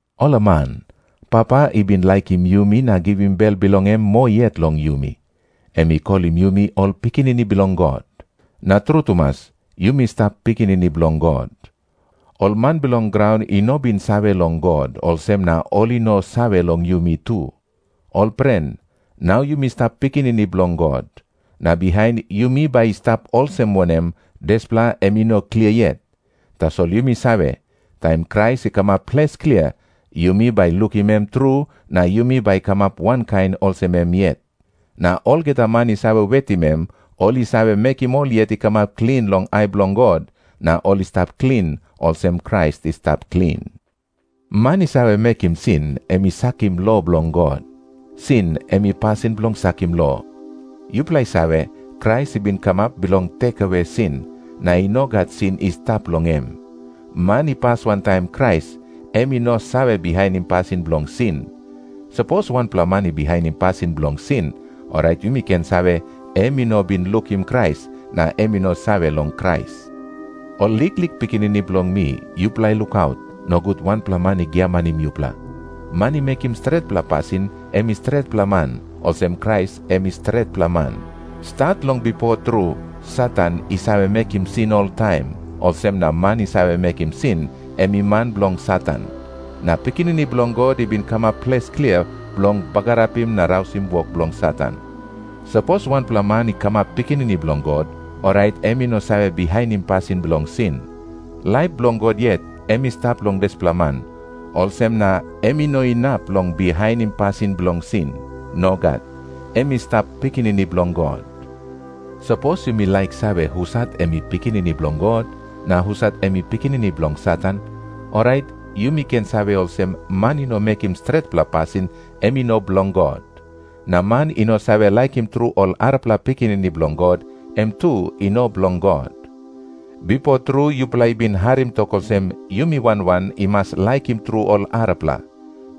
Olaman, Papa i bin laikim yumi na givim bel bilong em moa yet long yumi! Em i kolim yumi ol pikinini bilong God. Na tru tumas, yumi stap pikinini bilong God. Ol man bilong graun i no bin save long God, olsem na ol i no save long yumi tu. Ol pren, nau yumi stap pikinini bilong God. Na bihain yumi bai i stap olsem wanem, dispela em i no klia yet. Tasol yumi save, taim Krais i kamap ples klia, yumi bai lukim em tru, na yumi bai kamap wankain olsem em yet. Na olgeta man i save wetim em, ol i save mekim ol yet i kamap klin long ai bilong God, na ol i stap klin olsem Krais i stap klin. Man i save mekim sin, em i sakim lo bilong God. Sin em i pasin bilong sakim lo. Yupela i save, Krais i bin kamap bilong tekewe sin, na i no gat sin i stap long em. Man i pas wantaim Krais, em i no save bihainim pasin bilong sin. Sapos wanpela man i bihainim pasin bilong sin, orait yumi ken save, em i no bin lukim Krais, na em i no save long Krais. Ol liklik pikinini bilong mi, yupela lukaut, nogut wanpela man i giamanim yupela. Man i mekim stretpela pasin, em i stretpela man, olsem Krais em i stretpela man. Stat long bipo tru, Satan i save mekim sin oltaim, olsem na man i save mekim sin, em i man bilong Satan. Na Pikinini Bilong God i bin kamap ples klia bilong bagarapim na rausim wok bilong Satan. Sapos wanpela man i kamap pikinini bilong God, orait em i no save bihainim pasin bilong sin. Laip bilong God yet em i stap long dispela man, olsem na em i no inap long bihainim pasin bilong sin. Nogat. Em i stap pikinini bilong God. Sapos yumi laik save husat em i pikinini bilong God, na husat em i pikinini bilong Satan, orait yumi ken save olsem, man i no mekim stretpela pasin, em i no bilong God. Na man i no save laikim tru ol arapela pikinini bilong God, em tu i no bilong God. Bipo tru yupela i bin harim tok olsem, yumi wan wan i mas laikim tru ol arapela.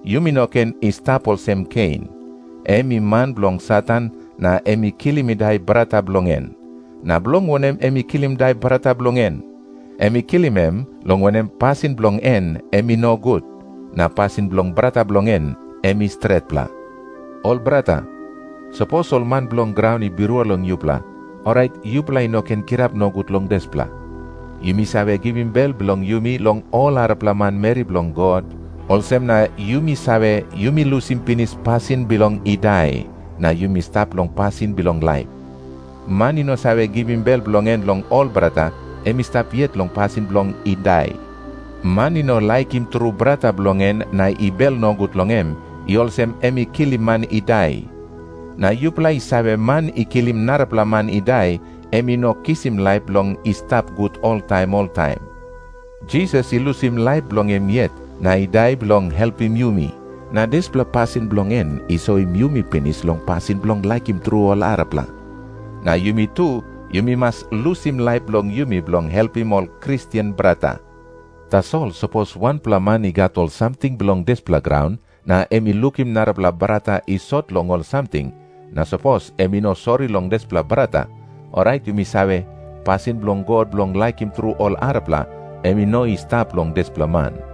Yumi no ken i stap olsem Kein. Em i man bilong Satan, na em i kilim i dai brata bilong en. Na bilong wanem em i kilim i dai brata bilong en? Em i kilim em, long wanem, pasin bilong en em i nogut, na pasin bilong brata bilong en em i stretpela. Ol brata, sapos ol man bilong graun i birua long yupela, orait yupela i no ken kirap nogut long dispela. Yumi save givim bel bilong yumi long ol arapela manmeri bilong God, olsem na yumi save, yumi lusim pinis pasin bilong i dai, na yumi stap long pasin bilong laip. Man i no save givim bel bilong en long ol brata, em i stap yet long pasin bilong i dai. Man i no laikim tru brata bilong en na i bel nogut long em, i olsem em i kilim man i dai. Na yupela i save, man i kilim narapela man i dai, em i no kisim laip bilong i stap gut oltaim oltaim. Jisas i lusim laip bilong em yet na i dai bilong helpim yumi, na dispela pasin bilong en i soim yumi pinis long pasin bilong laikim tru ol arapela. Na yumi tu yumi mas lusim laip bilong yumi bilong helpim ol Kristen brata. Tasol sapos wanpela man i gat ol samting bilong dispela graun, na em i lukim narapela brata i sot long ol samting, na sapos em i no sori long dispela brata, orait yumi save, pasin bilong God bilong laikim tru ol arapela, em i no i stap long dispela man.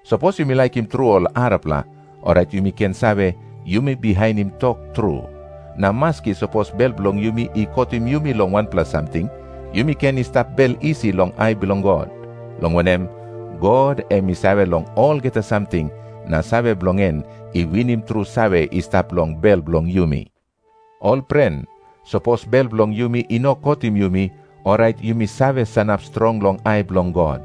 Sapos yumi laikim tru ol arapela, orait yumi ken save, yumi bihainim tok tru. Na maski sapos bel bilong yumi i kotim yumi long wanpela samting, yumi ken i stap bel isi long ai bilong God. Long wanem, God em i save long olgeta samting, na save bilong en i winim tru save i stap long bel bilong yumi. Ol pren, sapos bel bilong yumi i no kotim yumi, orait yumi save sanap strong long ai bilong God.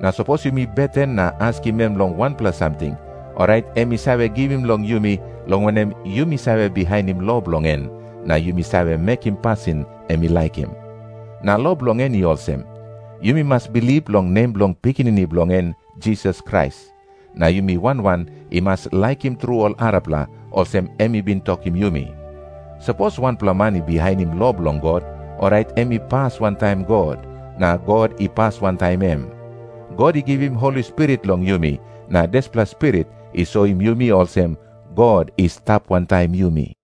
Na sapos yumi beten na askim em long wanpela samting, orait em i save givim long yumi, long wanem, yumi save bihainim lo bilong en, na yumi save mekim pasin em i laikim. Na lo bilong en i olsem. Yumi mas bilip long nem bilong Pikinini bilong en Jisas Krais, na yumi wan wan i mas laikim tru ol arapela, olsem em i bin tokim yumi. Sapos wanpela man i bihainim lo bilong God, orait em i pas wantaim God, na God i pas wantaim em. God i givim Holi Spirit long yumi, na dispela Spirit i soim yumi olsem, God i stap wantaim yumi.